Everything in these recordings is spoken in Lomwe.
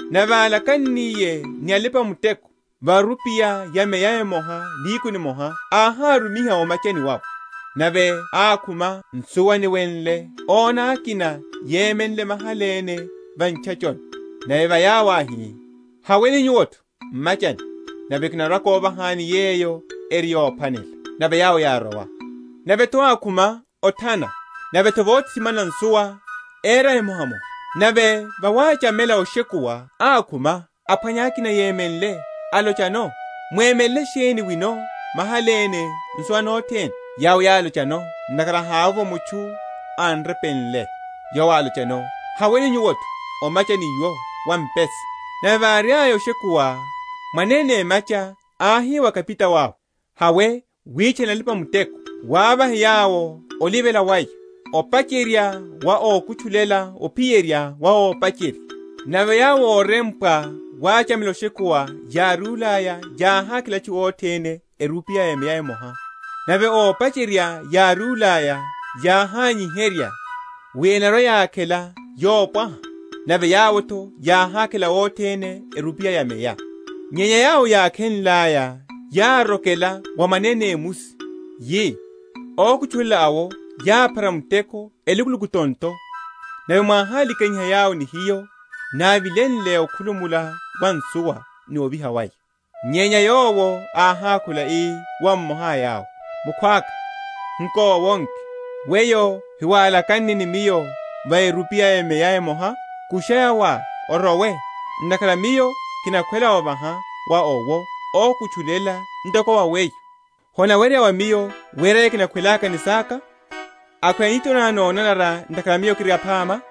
Nave álakanniye ni alipa‐muteko, va erupiya ya meya emoha nihiku nimoha, áhárumiha o’machani wawe. Nave ákhuma nsuwa niwenle, óna akina yemenle mahala ene va ntchachoni; nave wa yawo áhi, Haweni nyuwo’tho m’machani, nave kinarwa‐kovahani yeyo eri yophwanela. Nave yawo yárowa. Nave’tho ákhuma othana, nave’tho vothitimana nsuwa, éra emohamoha. Nave vawachamela oshekuwa ákhuma, aphwanya akina yemenle; alochano, Mwemelele sheni wino mahala ene nsuwa nothene? Yawo yálochano, Ntakhara hávovo mutchu án’repenle. Yowo álochano, Haweni nyuwo’tho o’machani iwo wa mpesa. Nave váriaya oshekuwa, mwanene emacha áhi wa kapitao awe, Hawe witchane alipa‐muteko, wavahe yawo olivela waya, opacherye wa ókutchulela ophiyerya wa ópacherya. Nave yawo órempwa vawachamela oshekuwa várúlaya, yáhákhela atchu othene erupiya ya meya emoha. Nave ópacherya várúlaya, yáhányiherya wi enarwa‐yakhela yopwaha, nave yawo’tho yáhákhela othene erupiya ya meya. Nyenya yawo yákhenlaya, yárokela wa mwanene emusi, yi, Ókutchulela awo yáphara muteko elukuluku tonto nave mwáhálikanyiha yawo ni hiyo návilenle okhulumula wa nsuwa ni oviha waya. Nyenya yowo áhákhula, ii wa mmoha a yawo, Mukhwaka, nkowonke, weyo hiwálakanne ni miyo va erupiya ya meya emoha? Kusha yawá, orowe; ntakhara miyo kinakhwela ovaha wa owo ókutchulela ntoko wa weyo. Honaweryeya wa miyo wera yeyo kinakhwelaka ni saka? Akhweya nitho ná nonanara ntakhara miyo kiri aphama?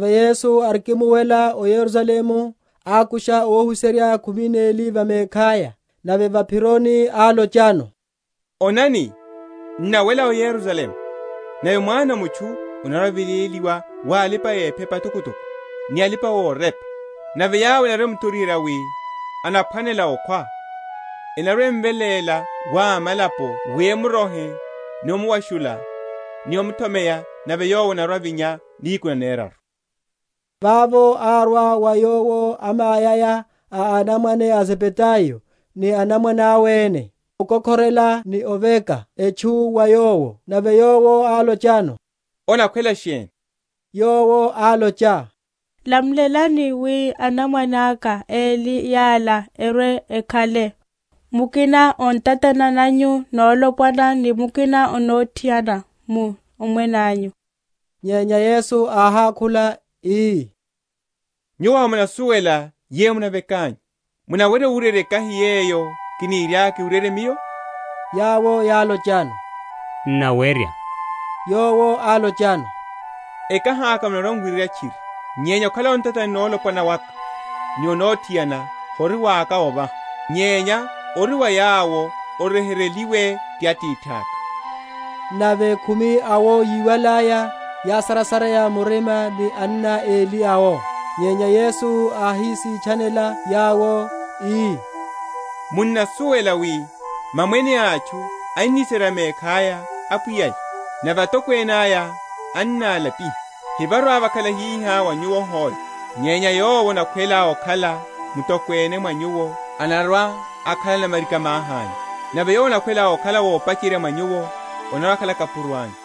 Nave Yesu arikimuwela o Yerusalemu, ákusha óhuserya khumi neli va mekhaya, nave va’phironi álochano, Onani, n’nawela o Yerusalemu; nave Mwana a mutchu anarwa‐aveléliwa wa alipa‐ephepa atokotoko ni alipa‐orepa, nave yawo enarwa‐emuthoriherya wi anaphwanela okhwa, enarwa‐emveléla wa amalapo wi emurohe ni omuwashula, ni omuthomeya; nave Yowo anarwa‐avíhiwa nihiku naneraru. Vavo árwa wa Yowo amayaya a anamwane a Zebedayo ni anamwane awe ene, amkokhorela, ni oveka etchu wa Yowo. Nave Yowo álochano, Onakhwela sheni? Yowo álocha, Lamulelani wi anamwane aka eli yala erwe‐ekhale, mukina o ntatani nanyu nolopwana, ni mukina o nothiana, mu Omwene anyu. Nyenya Yesu áhákhula ii, Nyuwo hamunasuwela yeyo munavekanyu. Munawerya owuryerya ekahi yeyo kiniriaka kiwuryerye Miyo? Yawo yálochano, N’nawerya. Yowo álochano, Ekahi aka munarwa‐muwuryerya tchiri: nyenya okhala o ntatani nolopwana waka, ni o nothiana, hori waka ovaha, nyenya ori wa yawo oryeheryeliwe ti Atithaka. Nave khumi awo yíwalaya, yásarasareya murima ni anna eli awo. Nyenya Yesu áhísitchanela yawo, ii, Munnasuwela wi mamwene a atchu ennisera mekhaya apwiya’ya, nave atokwene aya ennalapiha. Hevarwa‐vakhala hihá wa nyuwo hoe: nyenya yowo anakhwela okhala mutokwene mwa nyuwo, anarwa‐akhala namarika‐mahi anyu; nave yowo anakhwela okhala ópacherya mwa nyuwo, anarwa‐akhala kapuro anyu: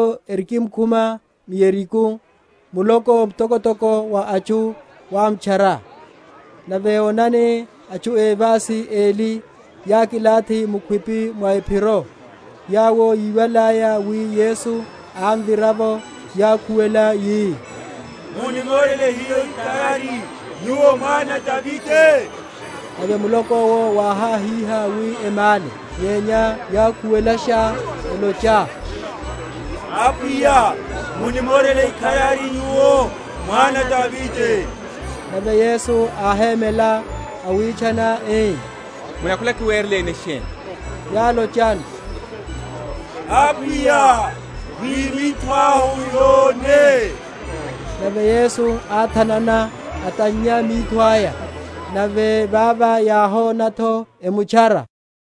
Nave yawo erikimkhuma m’Yeriko, muloko mtokotoko wa atchu wámtchara. Nave onani, atchu évasi eli yákilathi mukhwipi mwa ephiro, yawo yíwalaya wi Yesu ámvira’vo, yákhuwela yi, Munimorele hiyo ikharari, Nyuwo Mwana a Davide. Nave muloko’wo wáhahíha, wi emále. Nyenya yákhuwelasha, elocha, Apwiya, munimorele ikharari, Nyuwo Mwana a Davide. Nave Yesu áhémela, awitchana, ii, Munakhwela kiwereleni sheni? Yálochano, Apwiya, wi mitho ahu yone. Nave Yesu áthanana, atannya mitho aya: nave vava yáhona’tho, emutchara.